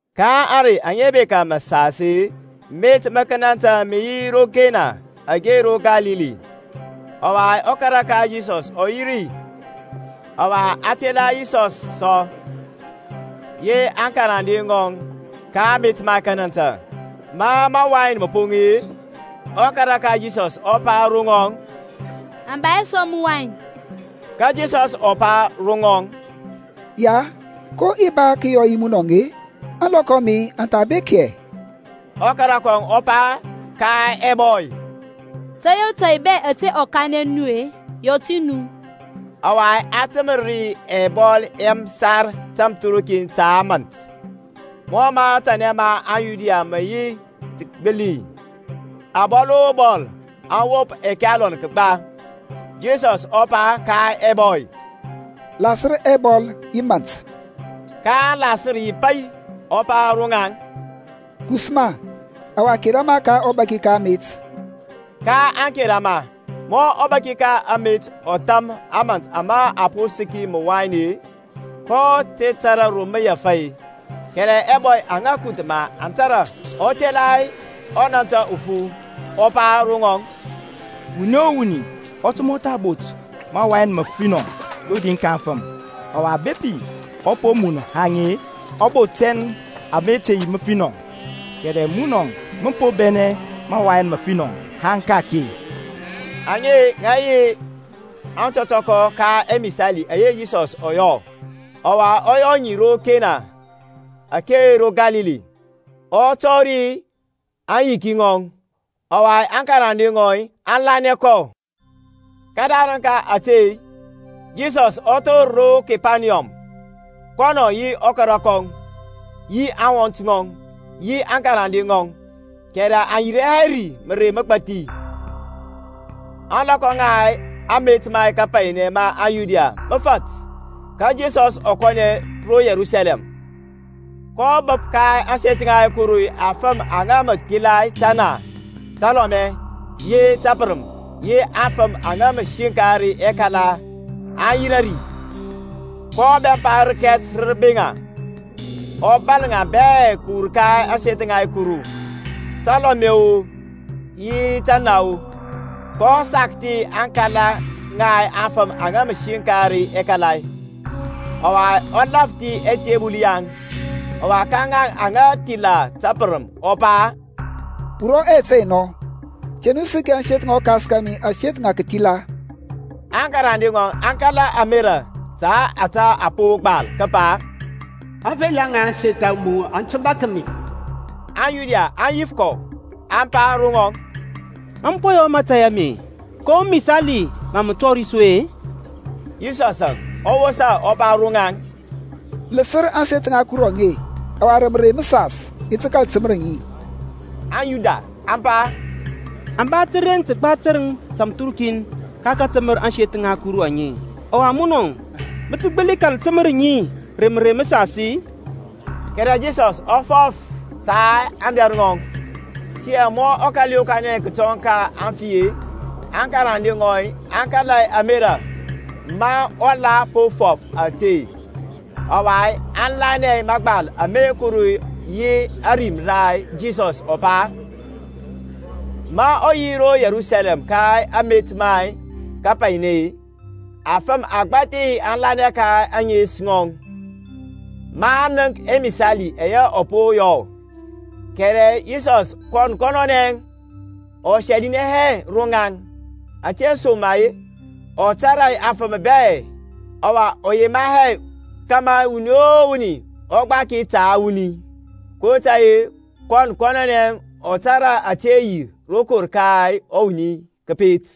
Ka ȧŋrey aŋa bekȧ məsas-e met ma kənantȧ mə yi ro Kena ake ro Kalili; ɔwa ɔkara ka Yisɔs ɔ yi ri: ɔwa a tela Yisɔs sɔ yi aŋkarande ŋɔŋ ka amet ma kanantə. Ma mawain mə poŋ-e, ɔkara ka Yisɔs ɔ pa ro ŋɔŋ, Aŋ ba hɛ sɔ məwain. Ka Yisɔs ɔ pa ro ŋɔŋ, Ya, ko i ba tə kəyɔ yi munɔŋ-e? Ȧŋlɔkɔ a mi aŋ tha bek hɛ. Ɔkara kɔŋ ɔ pa ka ɛbɔy, Tȧy o tȧy bɛ ȧte ɔ kanɛ nu-e, yɔ ti nu. Ɔwa a təmər ri ɛbɔl ɛ məsar tamthərukin ta mȧnt, mɔ matanɛ ma aŋYuda mə yi tə kəgbili, abɔl o bɔl aŋ wop ɛkalon kəgba. Yisɔsȧŋ ɔ pa ka ɛbɔy, Lasər ɛbɔl yi mȧnt. Ka aŋ lasər yi pai. Ɔ pa ro ŋaŋ, Kus ma, ɔwa kera ma ka ɔbaki ka amet. Kaŋ kera ma. Ma ɔbaki ka amet ɔ tham ȧmȧnt ama a po səki məwain-e, kɔ te tȧrȧ ro mə wur-e, (kɛrɛ ɛbɔy aŋa kuth maŋ tȧrȧ) ɔ tela ɔnantə ufu, ɔ pa ro ŋɔŋ, Wuni o wuni ɔ tə mɔtha bot mawain məfinɔ rodi ka aŋfəm: ɔwa bepi aŋ po mun haŋ-e, ɔ bot tɛn ama te yi məfinɔ; kɛrɛ munɔ mə po bɛnɛ mawain məfinɔ haŋ ka-ake. Aŋe ŋa yi aŋtɔtɔkɔ ka ɛmisali ɛyɛ Yisɔs ɔ yɔ, ɔwa ɔ yɔ ŋi ro Kena ake ro Kalili, ɔ tɔri aŋyiki ŋɔŋ, ɔwa aŋkarande ŋɔŋ aŋ lanɛ kɔ. Kədarəŋ ka ȧte-e, Yisɔs ɔ thor ro Kepaniyɔm, kɔnɔŋ yi ɔkara kɔŋ, yi aŋwɔnt ŋɔŋ, yi aŋkarande ŋɔŋ: kɛrɛ aŋ yirȧ hɛ ri mərey məgbathi. Ȧŋlɔkɔ ŋa amet ma kapainɛ ma aŋYuda mə fat, ka Yisɔs ɔ kɔnɛ ro Yerusalɛm. kɔ bəp ka ȧŋseth ŋa Kuru afəm aŋa mə thila təna, təlɔmɛ, yi təpərəm, yi aŋfəm aŋa mə siŋkar ɛkala aŋ yirȧ ri; kɔ bɛmpa rəkɛt rə rəbeŋa, ɔ bȧl ŋa bɛ kəwur ka ȧŋseth ŋa Kuru, talɔmɛ-o yi tana: kɔ sakthi aŋkala ŋa aŋfəm aŋa siŋkar ɛkala, ɔ lȧfthi ɛthebəl yaŋ: ɔwa ka ŋaŋ aŋa thila tapərəm ɔ pa, Wurɔ ɛyɛt ɛye nɔ: te nu səki ȧŋseth ŋa ɔKas kȧmi aseth ŋa kəthila. Aŋkarande ŋɔŋ aŋ kala ȧmerȧ ta ȧtȧ a po gbal kəpa, Aŋfela ŋa ȧŋseth a mu aŋ tə bȧk mi. AŋYuda aŋ yif kɔ, aŋ pa ro ŋɔŋ, Ma mə po yɔ mȧtȧy ame-e, ko misali mȧ mə tɔri su-e? Yisɔsȧŋ ɔ wosa, ɔ pa ro ŋaŋ, Ləsər ȧŋseth ŋa Kuru aŋe, ɔwa rə mərey məsas i ti kȧl təmər ŋi. AŋYuda aŋ pa, A ba təren təgba tərəŋ tȧmthərukin ka kȧtəmər ȧŋseth ŋa Kuru aŋe, ɔwa munɔ mə tə gbəli kȧl təmər ŋi rə mərey məsas-i? Kɛrɛ Yisɔsȧŋ ɔ fɔf ta aŋdɛr ŋɔŋ. Tiyȧŋ ma ɔ kȧl yokanɛ kətɔŋ ka aŋfi-e, aŋkarande ŋɔŋ aŋ kala ȧmerȧ ma ɔ la po fɔf ȧte; ɔwa aŋ lanɛ mȧgbal ma Kuru yi ȧrim ara Yisɔs ɔ pa. Ma ɔ yi ro Yerusalɛm ka amet ma kapainɛ-e, afəm agbȧthi aŋ lanɛ ka ȧŋes ŋɔŋ, maŋ nənk ɛmisali ɛyɛ ɔ po yɔ. Kɛrɛ Yisɔsȧŋ kɔn kɔnɔnɛ ɔ sɛlinɛ hɛ ro ŋaŋ, ȧtesoma-e ɔ tȧrȧ afəm bɛ, ɔwa ɔ yema hɛ kȧmȧ wuni o wuni ɔ gbaki ta wuni, kotȧy-e kɔn kɔnɔnɛ ɔ tȧrȧ ȧte yi rokor ka wuni kəpet.